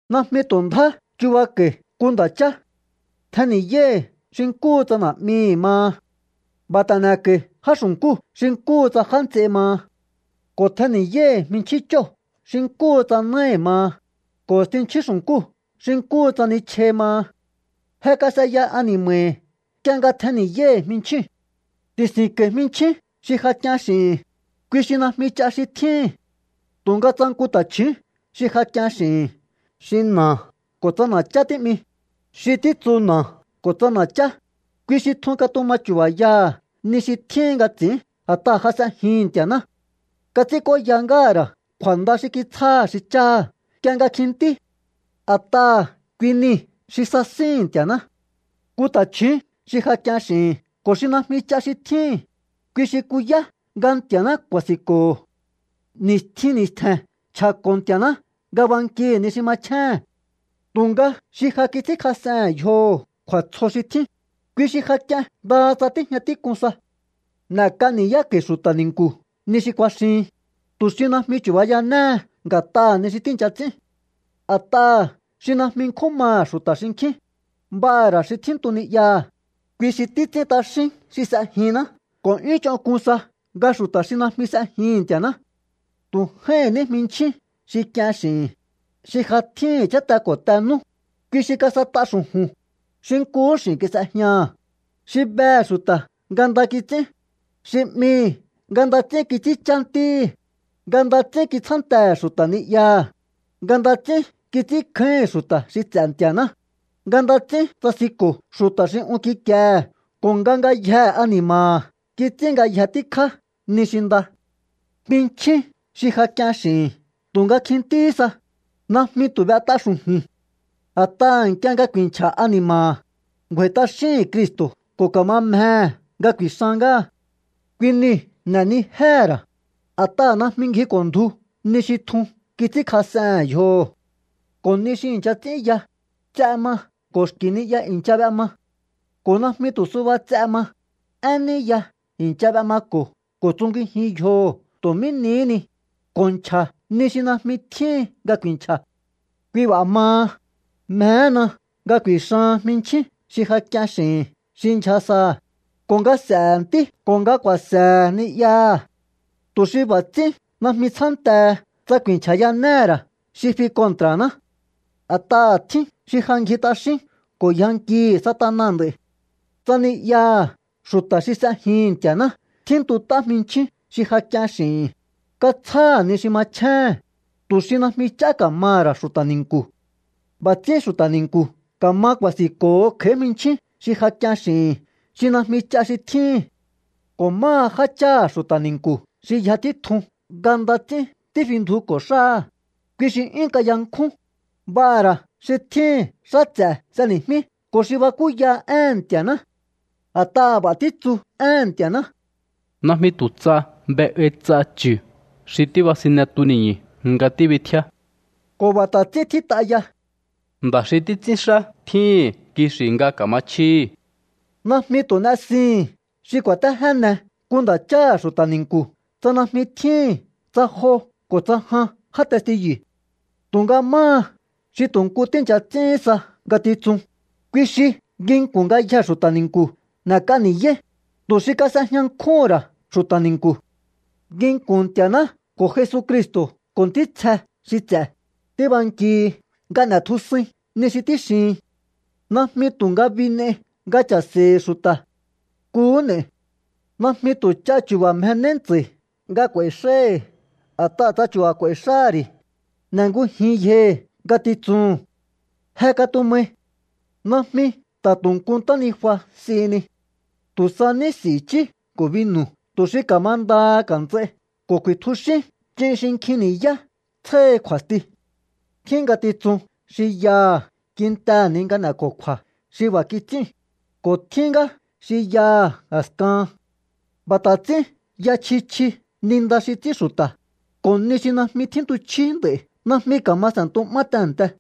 Najmi tu̱ ndjá chubako̱i̱ nku nda̱ chá. Tjenni̱yáíhi̱ xi nkúhu tsa na̱'mihi̱ maha. B'a̱ ta̱ n'e̱ko̱i já xu̱nkúu̱ xi nkúhu tsa já nts'ei maha. Ko̱ tjenni̱yáíhi̱ jminchjín chóo̱ xi nkúhu tsa náhi̱ maha, ko̱ i̱stinchjín xu̱nkúu̱ xi nkúhu tsa nichjai maha. Je kas'eya ani̱ma̱hi̱ nk'ie nga tjenni̱yáíhi̱ jminchjíu̱n. Ti̱si̱nko̱i̱ jminchín xi ja k'ien x'i̱hi̱n, kui xi najmi ch'a xi tjíhi̱n. Tu̱nga tsa nku ta̱chju̱ún xi ja k'ien x'i̱hi̱n xi na̱a ko̱ tsa na̱chá tí'mi, xi títsu na̱a ko̱ tsa na̱chá, kui xi tjun katuma chu̱ba̱yaha̱ ni xi tjíhin nga ts'i̱ín a̱t'aha̱ ja s'ejihi̱n Nti̱a̱ná. Kats'ínk'óya ngáha̱ ra̱ kju̱a̱nda xi kitsjáha̱ xi cháha̱ nk'ie nga kjintí. A̱t'aha̱ kui nii̱ xi sasíhi̱n Nti̱a̱ná. Nku ta̱chju̱ún xi ja k'ien x'i̱hi̱n ko̱ xi najmi ch'a xi tjíhi̱n, kui xi kuyá nga Nti̱a̱ná ku̱a̱si̱nko̱ho̱. Ni̱stjin ni̱stje̱n nchja̱ko̱ Nti̱a̱ná nga bankihi̱ ni xi machjéhe̱n. Tu̱nga xi ja kits'ínkjas'ehe̱n yjoho̱ kju̱a̱tsjo xi tjín, kui xi ja k'ien ndaha tsa tíjña tík'un sa. N'e̱k'a ni̱yáko̱i̱ xu̱ta̱ ni̱nku̱ ni xi kuaxihin, tu̱ xi najmi chu̱bayanéhe nga̱t'aha̱ ni xi tíi̱ncha ts'ín. A̱t'aha̱ xi najmi nkjún maha̱ xu̱ta̱ xinkjín, b'aha̱ ra̱ xi tjíntu ni'yaha̱, kui xi títs'ín t'axín xi s'ejinná ko̱ 'yún ch'onk'un sa nga xu̱ta̱ xi najmi s'ejihi̱n Nti̱a̱ná. Tu̱ j'áíhi̱n ní jminchjín xi k'ien x'i̱hi̱n, xi ja tjíhi̱n cháte ko̱ te nú, kui xi kas'et'a xu̱ju̱n, xi nkuhú x'i̱n kis'ejñaha̱, xi behe̱ xu̱ta̱ nga nda kits'ín, xi 'mihi̱ nga nda ts'ín kits'ínchá ntíhi̱, nga nda ts'ín kitsjántehe̱ xu̱ta̱ ni'yaha̱, nga nda ts'ín kits'ínkjáíhi̱n xu̱ta̱ xi ts'e̱ Nti̱a̱ná, nga nda ts'ín tsasinko̱ xu̱ta̱ xi un kikiehe̱ ko̱ nga ngayjehe ani̱ma̱ha̱ kits'ín ngayje tíkjá ni xi nda. Jminchjín xi ja k'ien x'i̱hi̱n tu̱nga kjintíhí sa, najmi tu̱ b'et'a xu̱ju̱i̱n. A̱t'aha̱ nk'ie nga ku̱i̱nchja̱ ani̱ma̱ha̱, ngju̱a̱i̱ t'axíhi̱n Cristo̱ ko̱ ka̱ma mjehe̱ nga ku̱i̱xan ngáha. Kui niu̱ n'e̱nijéhe̱ ra̱, a̱t'aha̱ najmi ngjiko̱ndju ni xi tjun kits'ínkjas'ehe̱n yjoho̱. Ko̱ ni xi i̱ncha ts'ín ya, ts'e ma ko̱ xki̱ ni'ya i̱ncha b'ema. Ko̱ najmi tu̱ suba ts'e ma, én ní ya i̱ncha b'emako̱ ko̱ tsungijin yjoho̱ tu̱ mí nihí ni, ko̱ nchja̱ ni xi najmi tjíhin nga ku̱i̱nchja̱. Kui b'a̱ maha, mjehena nga ku̱i̱xahan jminchjín xi ja k'ien xi̱hi̱n xi ndyja saha̱, ko̱ nga s'e̱he̱ ntí ko̱ nga ku̱a̱se̱he̱ ni'yaha̱, tu̱ xi b'a̱ ts'ín najmi tsjántehe tsa ku̱i̱nchja̱yanéhe̱ ra̱ xi fi kontra̱ná. A̱t'aha̱ tjín xi ja ngji t'axín ko̱ yjankihi̱ Satana nd'a̱i̱. Tsa ni'yaha̱ xu̱ta̱ xi s'ejihi̱n Nti̱a̱ná tjíntut'á jminchjín xi ja k'ien x'i̱hi̱n, katsjáha̱ ni xi machjéhe̱n, tu̱ xi najmi ch'á ka̱maha̱ ra̱ xu̱ta̱ ni̱nku̱. B'a̱ ts'ín xu̱ta̱ ni̱nku̱ ka̱ma ku̱a̱si̱nko̱ho kj'a̱í jminchjín xi ja k'ien x'i̱hi̱n xi najmi ch'a xi tjíhi̱n. Ko̱ máha jácháha̱ xu̱ta̱ ni̱nku̱ xi yja títjun nga nda ts'ín tífindjuko̱ xáha̱, kui xi 'yún kayankjún, b'aha̱ ra̱ xi tjíhi̱n xá ts'e̱ s'éni̱jmí ko̱ xi bakúya éhe̱n Nti̱a̱ná. A̱t'aha̱ b'a̱ títsu éhe̱n Nti̱a̱ná: “Najmi tu̱ tsa b'e'ai ts'a chu̱ xi tíbasine tuni̱ñu̱ nga tíbitjíá.” Ko̱ b'a̱ ta̱ ts'ín tjít'a ya: “Nda̱ xi títs'ínxá tjíhi̱n kixi̱ nga ka̱machjíhi̱.” Najmi tu̱ n'esihi̱n xi ku̱a̱téjéne nku nda̱cháha̱ xu̱ta̱ ni̱nku̱ tsa najmi tjíhi̱n tsa jo ko̱ tsa jan já testiyu̱. Tu̱nga máha xi tu̱ nku tíi̱ncha ts'íhín sa ngatitsun, kui xi nginku̱n ngayjee̱ xu̱ta̱ ni̱nku̱ n'e̱k'a ni̱yáí, tu̱ xi kas'ejña nkjúhu̱n ra̱ xu̱ta̱ ni̱nku̱. Nginku̱n Nti̱a̱ná ko̱ Jesucristo̱ ko̱ ntítsje xi ts'e̱, tíbankihi nga n'e̱tjusuin ni xi tíxihin. Najmi tu̱ ngabi n'ei nga cha̱se̱i̱hi̱ xu̱ta̱. Nkuhú n'e̱i̱. Najmi tu̱ ch'a chu̱ba̱ mjenéí ntsa̱i̱ nga k'u̱a̱i̱ xáíhi̱. A̱t'aha̱ tsa chu̱ba̱ k'u̱a̱i̱ xáhá ri̱, n'engujin yjohi̱ ngatitsuhu̱n. Je katumai. Najmi ta̱ tu̱ nku ntánijua s'ihini. Tu̱ sa ní s'i̱ i̱chí ko̱ binu̱ tu̱ xi ka̱mandaha ka̱nts'ai ko̱ ku̱i̱tjuxín ch'in xi nkjin ni̱yá tsjáhi kju̱a̱sti. Tjín ngatitsun xi yaha̱ kintehe̱ ni nga n'e̱ko̱kju̱a̱ xi b'a̱ kits'íu̱n, ko̱ tjín ngá xi yaha̱ a̱skahan. B'a̱ ta̱ ts'ín ya chji chji ni nda xi ts'ín xu̱ta̱, ko̱ ni xi najmi tjíntuchjí nd'a̱i̱ najmi ka̱ma s'e̱ntu'má tehe̱nte.